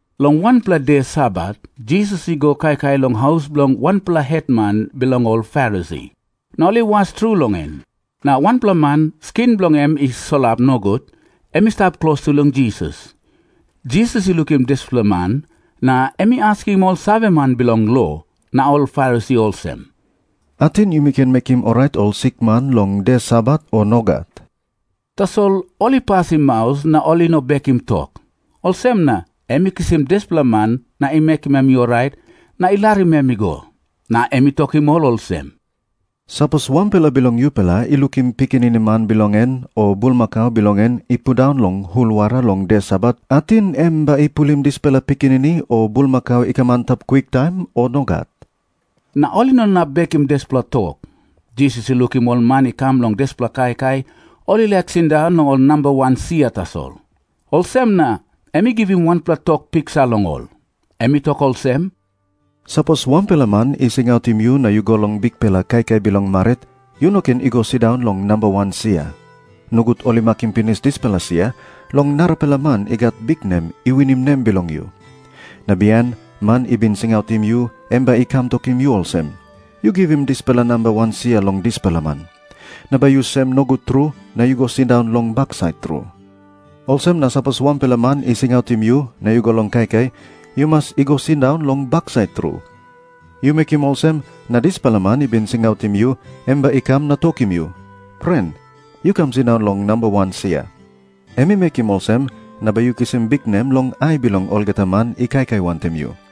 Long wanpela de Sabat Jisas i go kaikai long haus bilong wanpela hetman bilong ol Farisi. Na ol i was tru long em. Na wanpela man, skin bilong en i solap nogut, em i stap klostu long Jisas. Jisas i lukim dispela man, na em i askim ol saveman bilong lo na ol Farisi olsem, "Ating yumi ken mekim orait ol sikman long de Sabat, o nogat?" Tasol ol i pasim maus na ol i no bekim tok. Olsem na em i kisim dispela man na i mekim em i orait na i larim em i go. Na em i tokim ol olsem, "Sapos wanpela bilong yupela i lukim pikinini man bilong en o bulmakau bilong en i pundaun long hul wara long de Sabat, ating em bai i pulim dispela pikinini o bulmakau i kam antap kwiktaim, o nogat?" Na ol i no inap bekim dispela tok. Jisas i lukim ol man i kam long dispela kaikai, ol i laik sindaun long ol namba wan sia tasol. Olsem na em i givim wanpela tok piksa long ol. Em i tok olsem, "Sapos wanpela man i singautim yu na yu go long bikpela kaikai bilong marit, yu no ken i go sindaun long namba wan sia. Nogut ol i makim pinis dispela sia long narapela man i gat biknem i winim nem bilong yu. Na bihain man i bin singautim yu em bai i kam tokim yu olsem, 'Yu givim dispela namba wan sia long dispela man.' Na bai yu sem nogut tru na yu go sindaun long baksait tru. Olsem na sapos wanpela man i singautim yu na yu go long kaikai, yu mas i go sindaun long baksait tru. Yu mekim olsem, na dispela man i bin singautim yu em bai i kam na tokim yu, 'Pren, yu kam sindaun long namba wan sia.' Em i mekim olsem, na bai yu kisim biknem long ai bilong olgeta man i kaikai wantaim yu.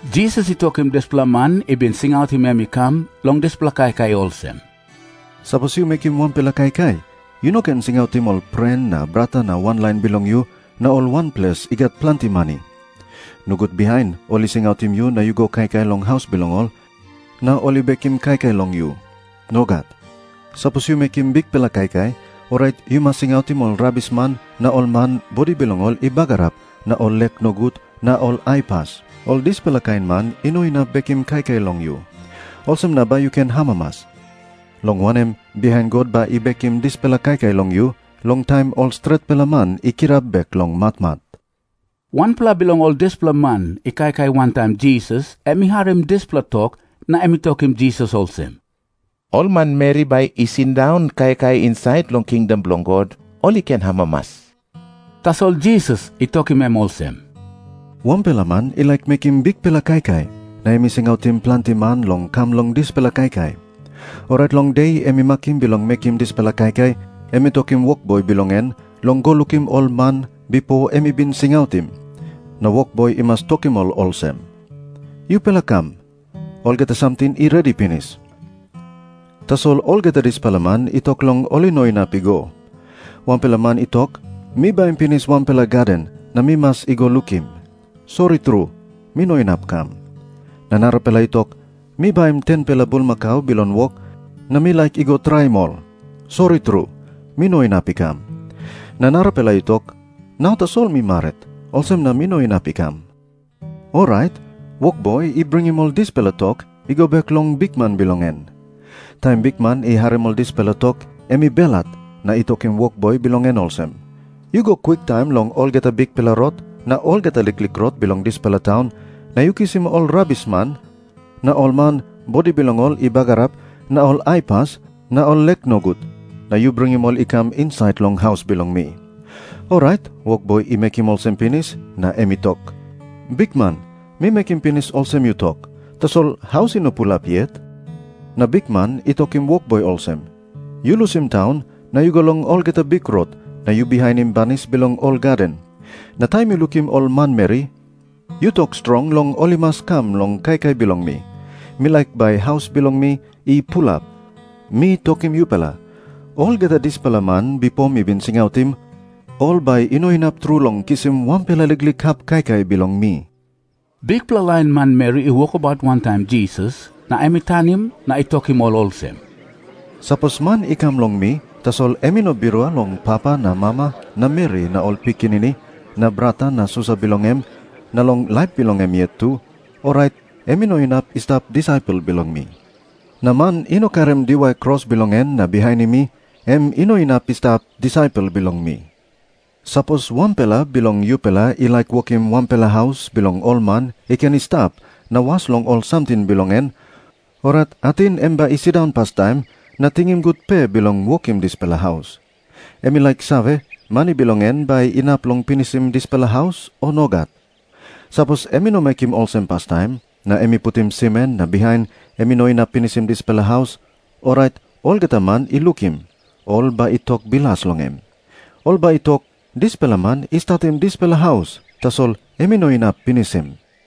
Jisas i tokim dispela man i bin singautim em i kam long dispela kaikai olsem, "Sapos yu mekim wanpela kaikai, yu no ken singautim ol pren na brata na wanlain bilong yu, na ol wanples i gat planti mani. Nogut bihain ol i singautim yu na yu go kaikai long haus bilong ol, na ol i bekim kaikai long yu. Nogat. Sapos yu mekim bikpela kaikai, orait yu mas singautim ol rabisman na ol man bodi bilong ol i bagarap na ol lek nogut na ol aipas. Ol dispela kain man i no inap bekim kaikai long yu. Olsem na bai yu ken amamas, long wanem, bihain God bai i bekim dispela kaikai long yu, long taim ol stretpela man i kirap bek long matmat." Wanpela bilong ol dispela man i kaikai wantaim Jisas, em I harim dispela tok na em i tokim Jisas olsem, "Ol manmeri bai i sindaun kaikai insait long kingdom bilong God, ol i ken amamas." Tasol Jisas i tokim em olsem, "Wanpela man i laik mekim bikpela kaikai, na em i singautim planti man long kam long dispela kaikai. Orait long de em i makim bilong mekim dispela kaikai, em i tokim wokboi bilong en long go lukim ol man bipo em i bin singautim. Na wokboi i mas tokim ol olsem, 'Yupela kam. Olgeta samting i redi pinis.' Tasol olgeta dispela man i tok long ol i no inap i go. Wanpela man i tok, 'Mi baim pinis wanpela gaden, na mi mas i go lukim. Sori tru, mi no inap i kam.' Na narapela i tok, 'Mi baim 10-pela bulmakau bilong wok, na mi laik i go traim ol. Sori tru, mi no inap i kam.' Na narapela i tok, 'Nau tasol mi marit. Olsem na mi no inap i kam.' "Orait wokboi i bringim ol dispela tok i go bek long bikman bilong en. Taim bikman i harim ol dispela tok, em i belhat na i tokim wokboi bilong en olsem, 'Yu go kwiktaim long olgeta bikpela rot na olgeta liklik rot bilong dispela taun, na yu kisim ol rabisman, na ol man bodi bilong ol i bagarap, na ol aipas na ol lek nogut, na yu bringim ol i kam insait long haus bilong mi.' "Orait wokboi i mekim olsem pinis, na em i tok, 'Bikman, mi mekim pinis olsem yu tok, tasol haus i no pulap yet.' "Na bikman i tokim wokboi olsem, 'Yu lusim taun na yu go long olgeta bikrot na yu bihainim banis bilong ol gaden, na taim yu lukim ol manmeri yu tok strong long ol i mas kam long kaikai bilong mi. Mi laik bai haus bilong mi i pulap. Mi tokim yupela, olgeta dispela man bipo mi bin singautim, ol bai i no inap tru long kisim wanpela liklik hap kaikai bilong mi.' " Bikpela lain manmeri i wokabaut wantaim Jisas, na em i tanim na i tokim ol olsem, "Sapos man i kam long mi, tasol em i no birua long papa na mama na meri na ol pikinini na brata na susa bilong em, na long laip bilong em yet tu, orait em i no inap i stap disaipel bilong mi. Na man i no karim diwai kros bilong en na bihainim mi, em i no inap i stap disaipel bilong mi. "Sapos wanpela bilong yupela i laik wokim wanpela haus bilong ol man i ken i stap na was long ol samting bilong en, orait ating em bai i sindaun pastaim na tingim gut pe bilong wokim dispela haus. Em i laik save, mani bilong en bai inap long pinisim dispela haus, o nogat. Sapos em i no mekim olsem pastaim, na em i putim simen na bihain em i no inap pinisim dispela haus, orait olgeta man i lukim, ol bai i tok bilas long em. Ol bai i tok, 'Dispela man i statim dispela haus, tasol em i no inap pinisim.'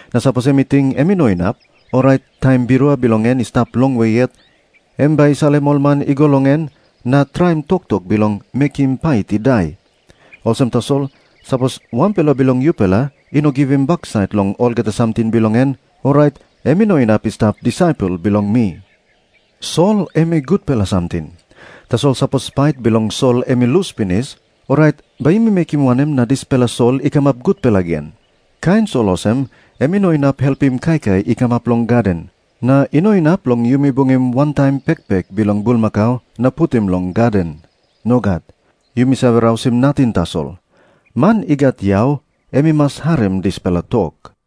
Na sapos em i ting em i no inap, orait taim birua bilong en i stap longwe yet, em bai i salim ol man i go long em na traim toktok bilong mekim pait i dai. "Olsem tasol, sapos wanpela bilong yupela i no givim baksait long olgeta samting bilong en, orait em i no inap i stap disaipel bilong mi." Jisas i tok moa olsem, "Sol em i gutpela samting. Tasol sapos pait bilong sol em i lus pinis, orait bai yumi mekim wanem na dispela sol i kamap gutpela gen? Kain sol olsem em i no inap helpim kaikai i kamap long gaden. Na i no inap long yumi bungim wantaim pekpek bilong bulmakau na putim long gaden. Nogat. Yumi save rausim nating tasol. Man i gat yau em i mas harim dispela tok."